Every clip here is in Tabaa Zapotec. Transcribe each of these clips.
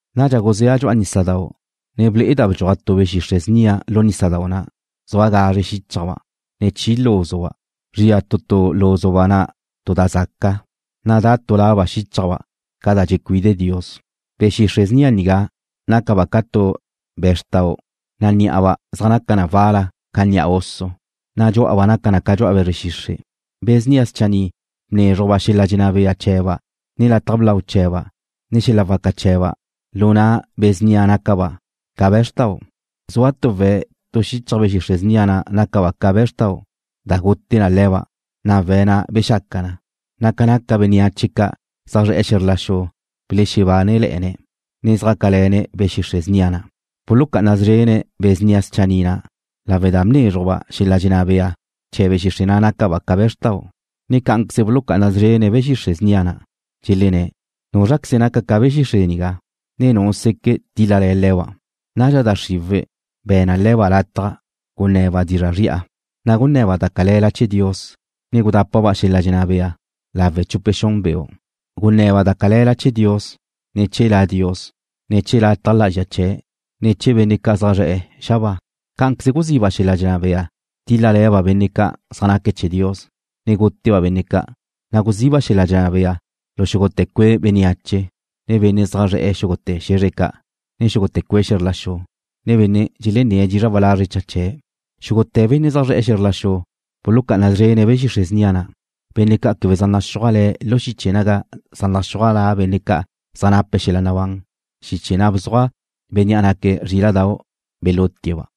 Nadxa guzéa' dxu'a nísadau', ne ble'eda' bdxuaj tu be̱ xixre' snia lu nísadau' na', zua gazre xíchajba', ne chi lúzuba'. Zria tu tu lúzuba' na' tu da zaca, na' da' tu laba' xíchajba' ca' da dxecuide Dios. Be̱ xixre' snia nigá nácaba' ca tu be̱zrtau', na' ní'aba' zaj naca na wal-la ca ni'a oso, na' dxú'aba' naca na ca dxu'a be̱zre xixre'. Be̱ snia schanni' bnézrujba' xel-la' dxenná bea chee̱ba', ne lataj blau chee̱ba', ne xel-la' waca chee̱ba' lu na' be̱ snia na' nácaba' ca be̱zrtau'. Zua tu we̱' tu xichaj be̱ xixre' snia na' nácaba' ca be̱zrtau' da gute na le̱ba', na' we̱' na' bexaca na, na' ca naca bénneache ca' zaj zre̱'e̱ lu xe̱zr la xu belexebánele̱'e̱ne̱', ne zjácale̱ne̱' be̱ xixre' snia na'. Bulucá'ana szrene̱' be̱ snia schanni' na' lawe' da bnézrujba' xel-la' dxenná bea chee̱ be̱ xixre' na' nácaba' ca be̱zrtau', ne cá'anqueze bulucá'ana szrene̱' be̱ xixre' snia na', dxelenné̱': ―¿Núzraqueze naca ca be̱ xixre' nigá, ne nu seque' tíl-lale̱ le̱ba'? Nadxa da xriwe̱' be̱ na le̱ba' lataj gunne̱ba' dizra' zri'a, na' gunne̱ba' da cale̱la chee̱ Dios, ne gudápaba' xel-la' dxenná bea lawe' chupe xun beu'. Gunne̱ba' da cale̱la chee̱ Dios, ne chee̱ La Dios, ne chee̱ lataj lá'azxa chee̱', ne chee̱ benne' ca' zaj zre̱'e̱ xabáa. Cá'anqueze guziba' xel-la' dxenná bea tíl-lale̱ba' benne' ca' zaj naque̱' chee̱ Dios, ne gútete̱ba' benne' ca', na' guziba' xel-la' dxenná bea lu xúgute̱ cue' bénneache, ne benne' zaj zre̱'e̱ xúgute̱ xe̱zre ca', ne xúgute̱ cue' xe̱zr la xu ca', ne benne' dxelenné̱' dizra' walazre' cha chee̱'. Xúgute̱ benne' zaj zre̱'e̱ xe̱zr la xu bulucá'ana szrene̱' be̱ xixre' snia na', benne' ca' quebe zaj naxúaj le̱' lu xiche naga zaj naxúaj la benne' ca' zaj nape̱' xel-la' nabán, xiche na' bzuaj Bénnea' naque̱' Zríla'dau' belutie̱'-ba'.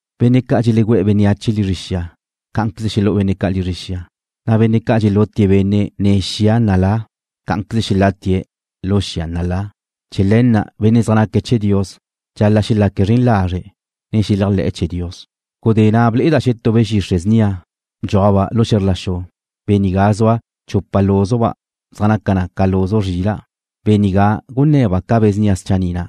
Benne' ca' dxelegú'e̱ bénneache lizre xia, cá'anqueze xelú'u benne' ca' lizre xia, na' benne' ca' dxelutie̱' benne' nen xia nalá, cá'anqueze xelatie̱' lu xia nalá. Chee̱ le̱ na' benne' zaj naque̱' chee̱ Dios dxal-la' xelaque̱' zren lazre', ne xeléajle̱'e̱ chee̱ Dios. Gudé na' ble'eda' xetú be̱ xixre' snia bdxúajba' lu xe̱zr la xu. Bea nigá zua chupa lúzuba' zaj naca na ca luzu zrila'. Bea nigá gunne̱ba' ca be̱ snia schanni' na'.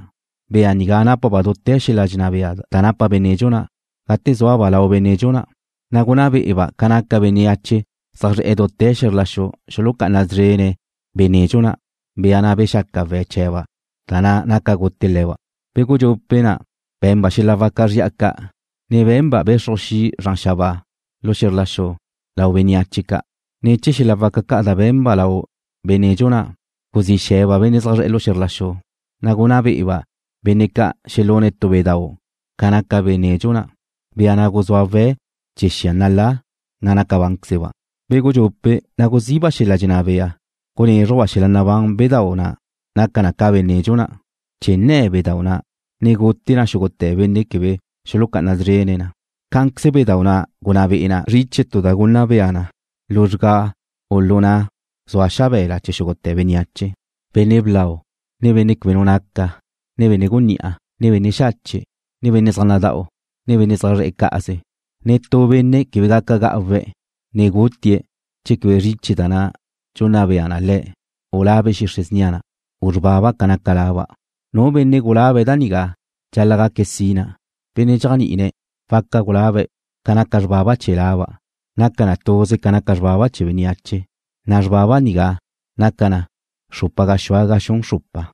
Bea nigá nápaba' dute̱ xel-la' dxenná bea da napa be̱ nedxu na', gate zúaba' lau be̱ nedxu na', na' gunná be'eba' ca naca bénneache zaj zre̱'e̱ dute̱ xe̱zr la xu xulucá'ana szrene̱' be̱ nedxu na', bea na' bexaca we̱' chee̱ba' da na' naca gute le̱ba'. Be̱ gudxupe' na' be̱nba' xel-la' waca zri'a ca', ne be̱nba' bexruj xi' zran xabáa lu xe̱zr la xu lau bénneache ca'. Ne̱ chee̱ xel-la' waca ca' da be̱nba' lau be̱ nedxu na', guzí xe̱ba' benne' zaj zre̱'e̱ xe̱zr la xu, na' gunná be'eba' benne' ca' xelune̱' tu bedau' ca naca be̱ nedxu na', bea na' guzúa we̱' chee̱ xia nalá, na' naca bánquezeba'. Be̱ gudxupe' na' guziba' xel-la' dxenná bea gunézrujba' xel-la' nabán bedau' na' naca na ca be̱ nedxu na', chee̱ nne̱ bedau' na', ne gute na xúgute̱ benne' quebe xulucá'ana szrene̱' na. Cá'anqueze bedau' na' gunná be'e na zriche tu da gunna bea na luzrgá u lu na' zua xabe̱la chee̱ xúgute̱ bénneache, benne' blau, ne benne' quebe nu naca, ne benne' gunní'a, ne benne' xache', ne benne' zaj nada'u, ne benne' zaj zre̱'e̱ cá'aze. Netú benne' quebe gaca ga'uwe̱' ne gutie̱' che quebe zriche da na' dxunna bea na le̱', u la be̱ xixre' snia na', u xrbaba ca naca laba'. Nu benne' gulabe̱' da nigá dxal-la' gaque̱' sina. Benne' dxéajni'ine̱' waca gulabe̱' ca naca xrbaba chee̱ laba'. Naca na tuze ca naca xrbaba chee̱ bénneache, na' xrbaba nigá naca na xrupa gaxúa ga xun xrupa.